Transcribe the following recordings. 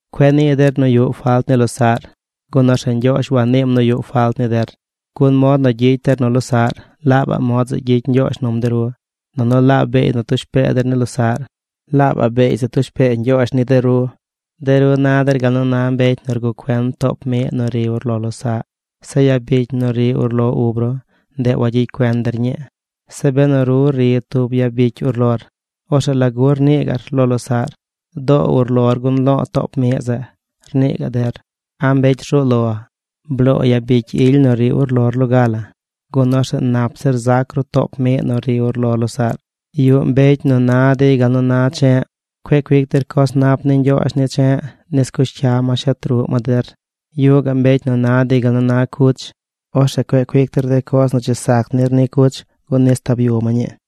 ’Cueꞌ nii der nu yuꞌ falt ni losaꞌr gun orzeꞌ Ñgyoozh waniim nu yuꞌ falt ni der. Gun mod nu gyicy der nu losaꞌr, laabaꞌ mod zeꞌ gyicy Ñgyoozh num de ru. Nunu laabaꞌ beey nu tush pee der ni losaꞌr, laabaꞌ beey zeꞌ tush pee Ñgyoozh ni de ru. De ru na der gal nu na mbecy nu rguꞌ cuen toop miꞌ nu ri urlo losaꞌ. Zeꞌ yabicy nu ri urlo ub ru, ndeꞌ wagyicy cuen der ñii. Zeꞌ benu ru ri tub yabicy urlor, orzeꞌ ¿lagu rnii gaꞌr lo losaꞌr: “Doo urlor gun lo̱o̱ toop miꞌ zeꞌ”, rnii gaꞌ der? ¡A mbecy rzuu lo! Bloo yabicy ily nu ri urlor loga la, gun orzeꞌ nap zir zac ru toop miꞌ nu ri urlo losaꞌr. ’Yuꞌ mbecy nu na dey gal nu na che̱ꞌ. Cueꞌ cuic der coz nap ni Ñgyoozh ni che̱ꞌ nis cush cya ma shet ruꞌ ma der. Yuꞌ gaꞌ mbecy na dey gal nu na cuch. Orzeꞌ cueꞌ cuic der de coz nu dzi sac nir ni cuch gun nis tab yu ma ñii.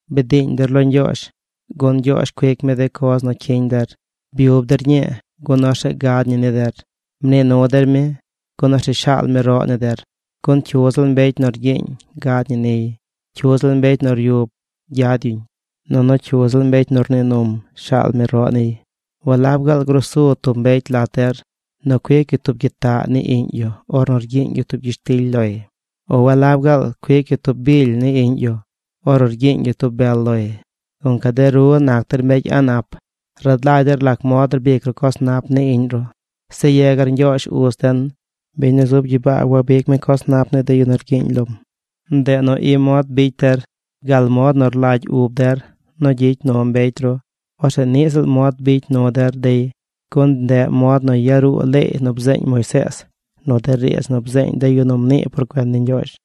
’Bdiiñ der lo Ñgyoozh, gun Ñgyoozh cuic mi de coz nu cyiñ der. Byub der ñii gun orzeꞌ gad ñi ni der. Mnii nu der mi, gun orzeꞌ shaal mi roꞌ ni der. Gun cyu ziꞌl mbecy nu rgyiiñ, gad ñi niy. Cyu ziꞌl mbecy nu ryub, gyad yuñ. Nunu cyu ziꞌl mbecy nu rnii num, shaal mi roꞌ niy. ’¿Walab gaal grusu tub mbecy lat der nu cuic yu tub gyitaꞌ ni iꞌñ yu ornu rgyiiñ yu tub gyishtily loy? ¿O walab gaal cuic yu tub bily ni iꞌñ yu ornu rgyiiñ yu tub bel loy? Gunca de ru nac der mbecy a̱ꞌ nap rad lagy der lac mod rbic ru coz nap ni iꞌñ ru, zeꞌ yegar Ñgyoozh, uz den, biñ nu zub gyibaa wabicy mi coz nap ni de yu nu rgyiiñ lom. ’Ndeꞌ nu i mod bicy der: Gal mod nu rlagy ub der nu gyicy nu mbecy ru, orzeꞌ niꞌ ziꞌl mod bicy nu der dey. Gun ndeꞌ mod nu yaruu leey nu bzeeñ Moisees nu de riidz nu bzeeñ de yu nu mnii por cuen ni Ñgyoozh.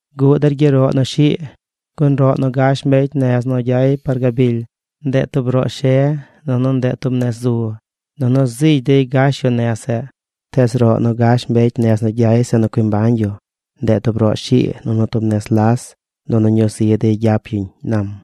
’Guꞌ der gyeroꞌ nu shii. Gun roꞌ nu gash de mbecy nez nu gyay par gabily, ndeꞌ tub roꞌ she nunu ndeꞌ tub nez zu. Nunu zigy dey gash yu nez zeꞌ. Tees roꞌ nu gash mbecy nez nu gyay zeꞌ nu cui mbañ yu, ndeꞌ tub roꞌ shii nunu tub nez las. Nunu ñuu zi dey gyap yuñ ―nam―.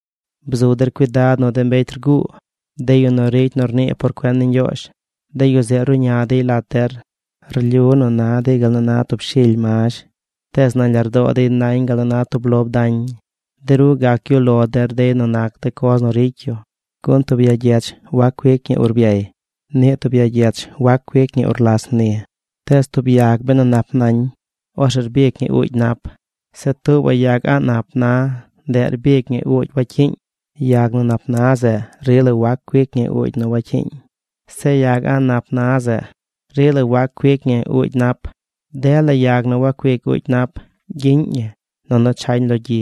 ’Bzu der cuidad nu de mbecy rguu, de yu nu ricy nu rnii por cuen ni Ñgyoozh. De yu zeꞌ ruꞌña dey lat der. Rlyu nu na dey gal nu na tub shily mazh. Tees nañ lardoo dey nañ gal nu na tub lob dañ. De ru gac gyuꞌ lo der dey nu nac de coz nu ricy yu. Gun tub ya gyech wac cuic ñi urbyay. Niꞌ tub ya gyech wac cuic ñi urlas mni. Tees tub yag benu nap nañ, orzeꞌ rbic ñi uugy nap. Zeꞌ tuubaꞌ yag a̱ꞌ nap na, ndeꞌ rbic ñi uugy wacyiiñ. Yag nu nap na zeꞌ rila wac cuic ñi uugy nu wacyiiñ. Zeꞌ yag a̱ꞌ nap na zeꞌ, rila wac cuic ñi uugy nap. Dela yag nu wacuic uugy nap gyiꞌñ ñi, nunu chañ lo gyi.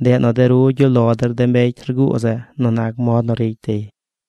Ndeꞌ nu de ru gyuꞌ lo der de mbecy rguu zeꞌ nu nac mod nu ricy dey.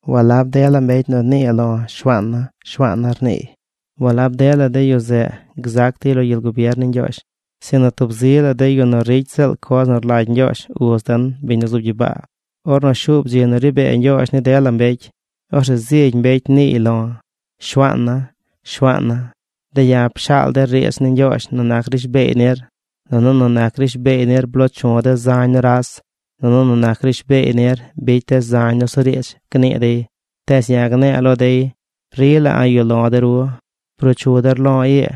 ’Walab dela mbecy nu nii lo̱: “Shuaana̱, Shuaana̱”, rniiy, walab dela de yu zeꞌ gzac dey lo gyel gubier ni Ñgyoozh, sinu tub zi la de yu nu ricy ziꞌl coz nu rlagy Ñgyoozh, uz den, biñ nu zub gyibaa. Ornu shuub dzi nu ri bee Ñgyoozh ni dela mbecy, orzeꞌ zigy mbecy niiy lo̱: “Shuaana̱, Shuaana̱, de̱ ya̱ pshaal de̱ riidz ni Ñgyoozh nu nac rishbeey nir. Nunu nu nac rishbeey nir bloo chu̱ de̱ zañ nuras. Nunu nu nac rishbeey nir bicy de̱ zañ nusuriidz”, gnii dey. Tees ya̱ gne̱e̱ lo dey: “Rila a̱ꞌ yuꞌ lo̱ de ru. Bruu chu der lo̱ ii,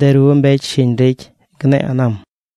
de ru mbecy shiñ ricy”, gne̱e̱ ―nam―.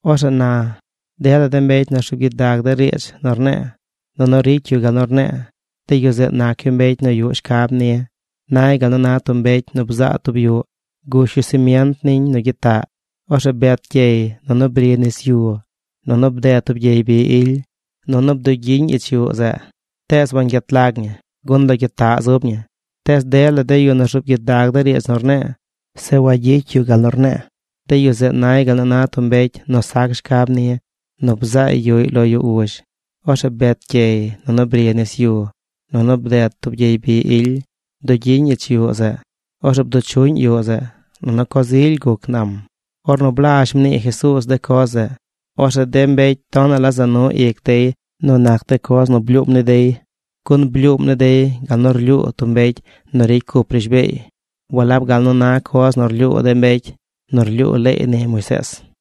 ’Orzeꞌ na, dela de mbecy nu rzuub gyidag de riidz nu rne̱e̱ nunu ricy yu gal nu rne̱e̱, de yu zeꞌ nac yu mbecy nu yuꞌ shcab ni. Nay gal nu na tub mbecy nu bzaa tub yuꞌ. Gush yu semient niñ nu gyitaꞌ. Orzeꞌ bet gyey. Nunu bri nis yu. Nunu bded tub gyey bi ily. Nunu bdugyiñ ich yuꞌ zeꞌ tees wangyet lag ñi, gun lo gyitaꞌ zub ñi. Tees dela de yu nu rzuub gyidag de riidz nu rne̱e̱, zeꞌ wagyicy yu gal nu rne̱e̱, de yu zeꞌ nay gal nu na tub mbecy nu sac shcab ni nu bzaay yuꞌy lo yu uzh. Orzeꞌ bet gyey. Nunu bri nis yu. Nunu bded tub gyey bi ily. Bdugyiñ ich yuꞌ zeꞌ. Orzeꞌ bduꞌ chuꞌñ yuꞌ zeꞌ. Nunu coz ily guc ―nam. Ornu blazh mnii Jesuuz de coz zeꞌ, orzeꞌ de mbecy tonaꞌ la za nu ic dey nu nac de coz nu blyuum ni dey. Gun blyuum ni dey gal nu rlyuu tub mbecy nu ricy cup rishbeey, walab gal nu na coz nu rlyuu de mbecy nu rlyuu leey ni Moisees.